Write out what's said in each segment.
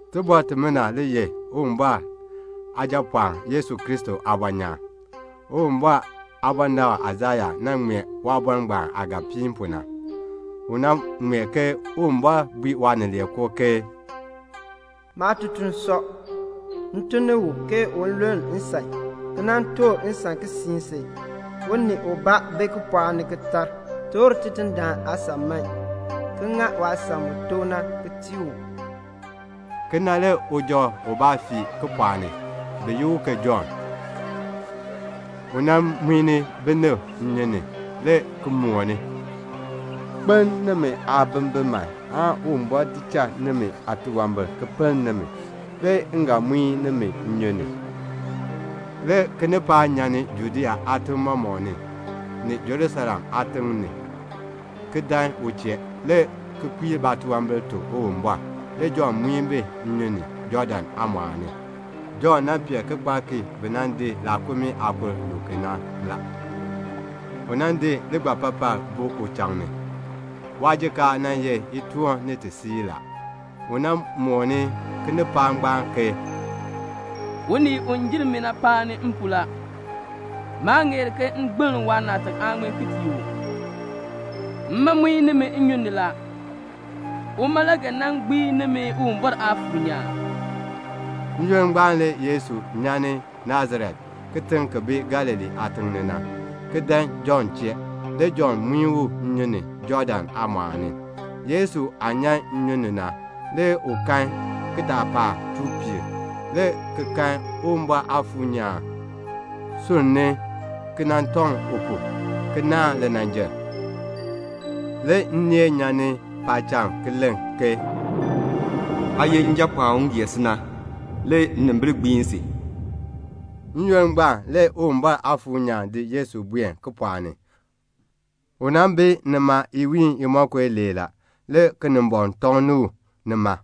Tibɔr timina le ye Uwumbɔr Aajapɔɔn Yesu Kristo aabɔnyaan. Uwumbɔr aabɔnabr Aisaya nan ŋmee waabɔr ngbaan aah ga piin pu na. U nan ŋmee ke Uwumbɔr bui Waanileekoo ke "'Maatutuln sɔ. M tun ni u, ke un luln nsan, ki nan toor nsan ki siin si.' Unii ubaa bi kipɔɔk ni ki tar, 'Toor Tidindaan aasan man, ki ŋa waasan mu tok na ki tii u."' Kena le uja ubaa fii kipɔɔk ni, bi yi u ke Jɔnn. U di binib ki muin bi nnyun ni, le ki mooni, "Kpeln nimi aabimbin man aan Uwumbɔr di cha nimi aatunwambir ki pinn nimi, le m ga muin nimi nnyun ni." Le kinipaak nyan Judea aatim mɔmɔk ni, ni Jerusalem aatiŋ ni, ki dan u chee, le ki kpiir baatunwambir ki tuk Uwumbɔr. Le Jɔnn muin bi nnyun ni, Jɔɔdan aamɔɔl ni. Jɔnn pee kikpalk ki bi nan di laakumii aakur ki luu ki na. U di ligbapapaln di buu uchaŋ ni. Waajikaar ye itoon ni tisiir la. U mooni kinipaak ngbaan ke, "Unii u jer mi na paani m pu la. Maa ŋeer ke m gbiln waanaatak aaŋmin ki tii u. Mma muin nimi nnyun ni la. Uma le ga gbiin nimi Uwumbɔr Aafuur nyaan." N-yoonn ngbaan le Yesu nyan Nasaret, kitiŋ ki bi Galilee na, ki dan Jɔnn chee. Le Jɔnn muin u nnyun ni, Jɔɔdan aamɔɔl ni. Yesu aah nyan nnyun ni na, le u kan kitaapaak chuu piir, le ki kan Uwumbɔr Aafuur nyaan sunni ki nan tɔŋ u pu, ki naahn linanjil. Le nneel nyan ni paacham ki len, "Aa ye Njapɔɔn u m gee si na. Le nnimbil gbiin si." N-yoonn ngbaan le Uwumbɔr Aafuur nyaan di Yesu buen kipɔɔk ni. U nan bi nima iwiin imonko ilee la. Le Kinimbɔŋ tɔŋni u nima.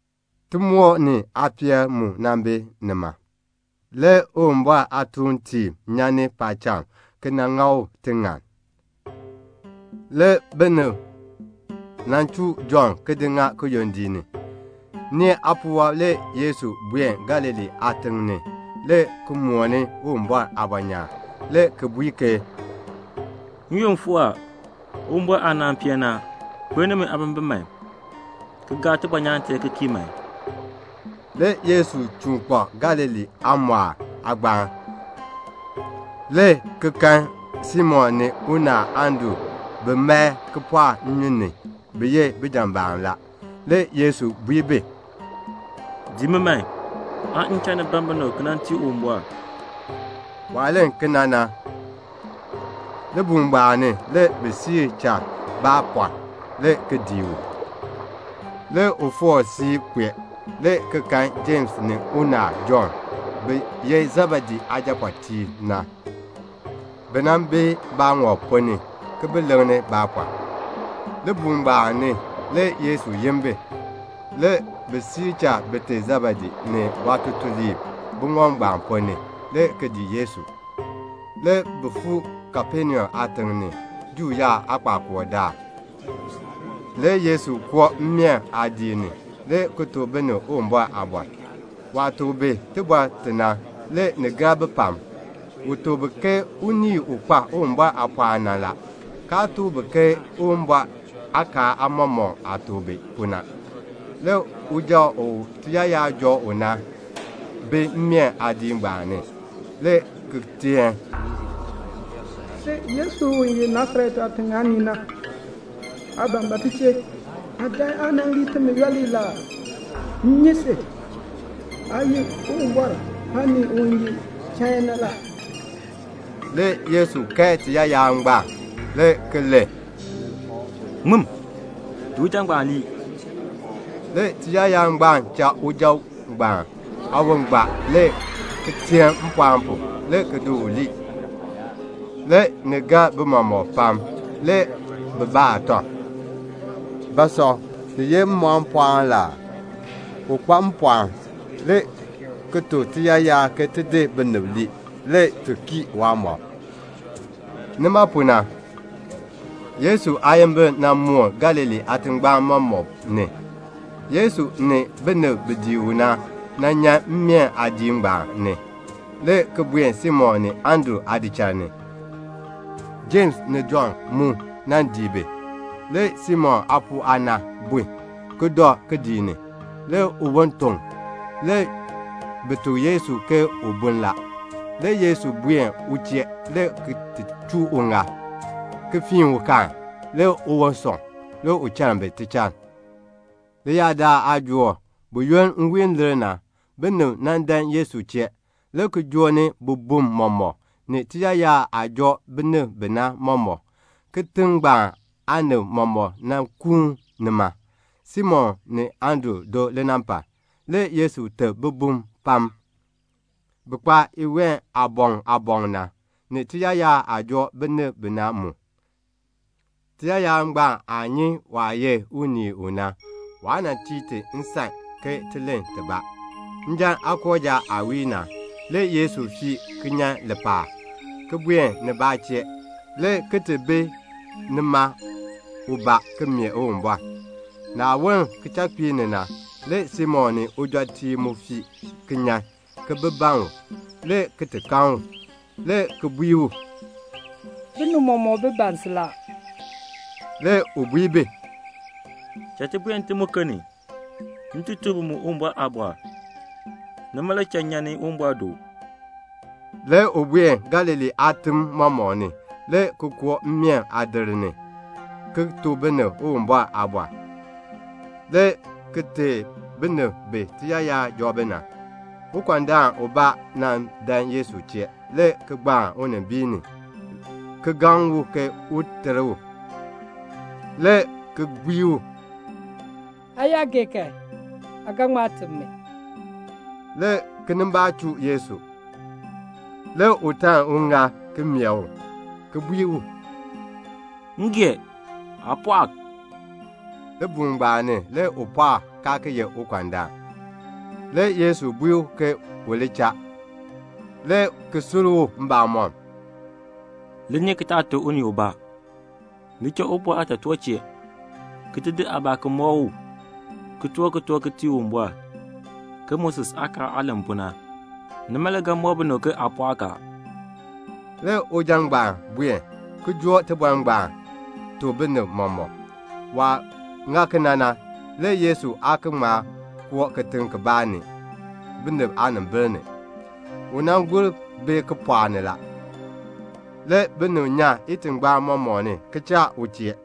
Timoor ni aapeel mu nan bi nima. Le Uwumbɔr aatuuntiib nyan ni paacham ki dan nan ŋa u tiŋann. Le binib nan di Jɔnn di ŋa kiyondiik ni. Nee aapuwɔb, le Yesu buen Galilee aatiŋ ni, le ki mooni Uwumbɔr aabɔnyaan, le ki bui ke, "N-yoonn fuu a. Uwumbɔr aanaan peen ni a. Kpeln nimi aabimbin man, ki gaa tibɔnyaan tee ki kii man." Le Yesu chuun kpak Galilee aamɔɔl aagbaan, le ki kan Simon ni unaal Andru bi mae kipɔɔk nnyun ni; bi ye bijambaam la. Le Yesu bui bi, "Dii mi man, aan m cha ni ban binib ki nan tii Uwumbɔr." Waah len kena na, libuul ngbaan ni le bi di cha baapɔr, le ki dii u. Le u foor siib ki kpee, le ki kan Jems ni unaal Jɔnn, bi ye Sebedee aajapɔɔtiib. Bi nan bi baaŋɔb ponn ni, ki bi leŋni baapɔr. Libuul ngbaan ni le Yesu yin bi. Le bi cha bite Sebedee ni waatutuliib buŋɔb ngbaan ponn ni, le ki dii Yesu. Le bi fuu Kapenaum aatiŋ ni. Juu yaab aakpakool daal le Yesu koo mmeen aadiik ni, le ki tuk binib Uwumbɔr aaliin. Waah tuk bi iliin i na, le ni gar bi pam. U tuk bi ke unii u kpa Uwumbɔr aapɔɔn na la, kaa tuk bi ke Uwumbɔr aakaal aamɔmɔkb aah tuk bi pu na. Le uja u tiyaayar joo u na bi mmeen aadiik ngbaan ni, le ki teen, "Sin Yesu u ye Nasaret aatiŋ aanii na, aa ban ba ti chee? Aa dan aa nan lii timi yooli la aa? M nyi si. Aa ye Uwumbɔr aanii u ye chain na la." Le Yesu kae tiyaayar ngbaan, le ki len, "Ŋmim. Di uja ngbaan lii." Le tiyaayar ngbaan cha uja ngbaan aawon gbaa, le ki teen mpɔɔn pu, le ki di u lii. Le ni gar bi mɔmɔk pam. Le bi baa tɔb, "Ba sɔ? Ni ye mmɔkm pɔɔn la aa? U kpa mpɔɔn, le ki tuk tiyaayar ke ti di binib lii, le ti kii waamɔb." Nima pu na, le Yesu aayimbil moon Galilee aatingbaan mɔmɔk ni. Le Yesu ni bin dii u na nyan mmeen aadiik ngbaan ni, le ki buen Simon ni Andru aadichal ni. Jems ni Jɔnn mu dii bi. Le Simon aapuu aana bun, ki dɔ kidiik ni. Le uwon ton. Le bi tuk Yesu ke u bun la. Le Yesu dan u chee, le ki chuu uŋaal, le ki fiin u kaan. Le uwon sɔŋ. Le u chann bi tichann. Leyaadaal aajook le nwiin aah lir na, le binib nan dan Yesu chee, le ki joo ni bibum mɔmɔk, ni tiyaayar aah joo binib bi na mɔmɔk. Kitiŋ ngbaan aanib mɔmɔk nan kuun nima, Simon ni Andru do linampal. Le Yesu teb bibum pam, bi kpa iween aaboŋ aaboŋ na, ni tiyaayar aah joo binib bi na mu. Tiyaayar ngbaan nyi u. Nima le waa cha ti len tibaa. Njan aakooja aah wii na, le Yesu fii ki nyan lipaal, ki buen nibaa chee, le ki ti bi ubaa ki mee Uwumbɔr. Le naah woln kichakpiik ni na, Simon ni ujɔtiib mu fii ki nyan, ki bi ban u, le ki ti kan u, le ki bui u, "Binib mɔmɔk le ban si." Le u bui bi, "Cha ti buen ntim muken ni, m ti tuk bi mu Uwumbɔr aaliin. Nima le cha m nyan ni Uwumbɔr do." Le u buen Galilee aatim mɔmɔk ni, le ki koo mmeen aadir ni, le ki tuk binib Uwumbɔr aaliin, le ki teei binib bi tiyaayar joo bi na. Le ukɔndaan ubaa dan Yesu chee, le ki gbaan unimbiin ni, le ki gaŋ u ke un ter u, le ki bui u, "Aa yaa gee kan, aa ga ŋma teb mi." Le kinimbaak chuu Yesu. Le u taln uŋaal, ki meeh u, le ki bui u, "M gee. Aa pɔɔk." Libuul ngbaan ni le u pɔɔk, kaa ki ye ukɔndaan. Le Yesu bui u ke u li cha, le ki sur u mbamɔm, "Li nyi ki taa tuk unii ubaa. Li cha Uwumbɔr aatotoor chee, ki di aabaa ki di mɔk u, ki toor kitork ki tii Uwumbɔr, ke Moses aakaal aah len pu na. Nima le ga mɔk binib ke aa pɔɔk a." Le uja ngbaan buen, ki joo tibɔr ngbaan, ki tuk binib mɔmɔk. Waah ŋa kena na, le Yesu aa ki ŋma koo kitiŋ kibaa ni, binib aanimbil ni. U nan gur bi kipɔɔk ni la. Le binib nyan itingbaan mɔmɔk ni, ki choo u chee.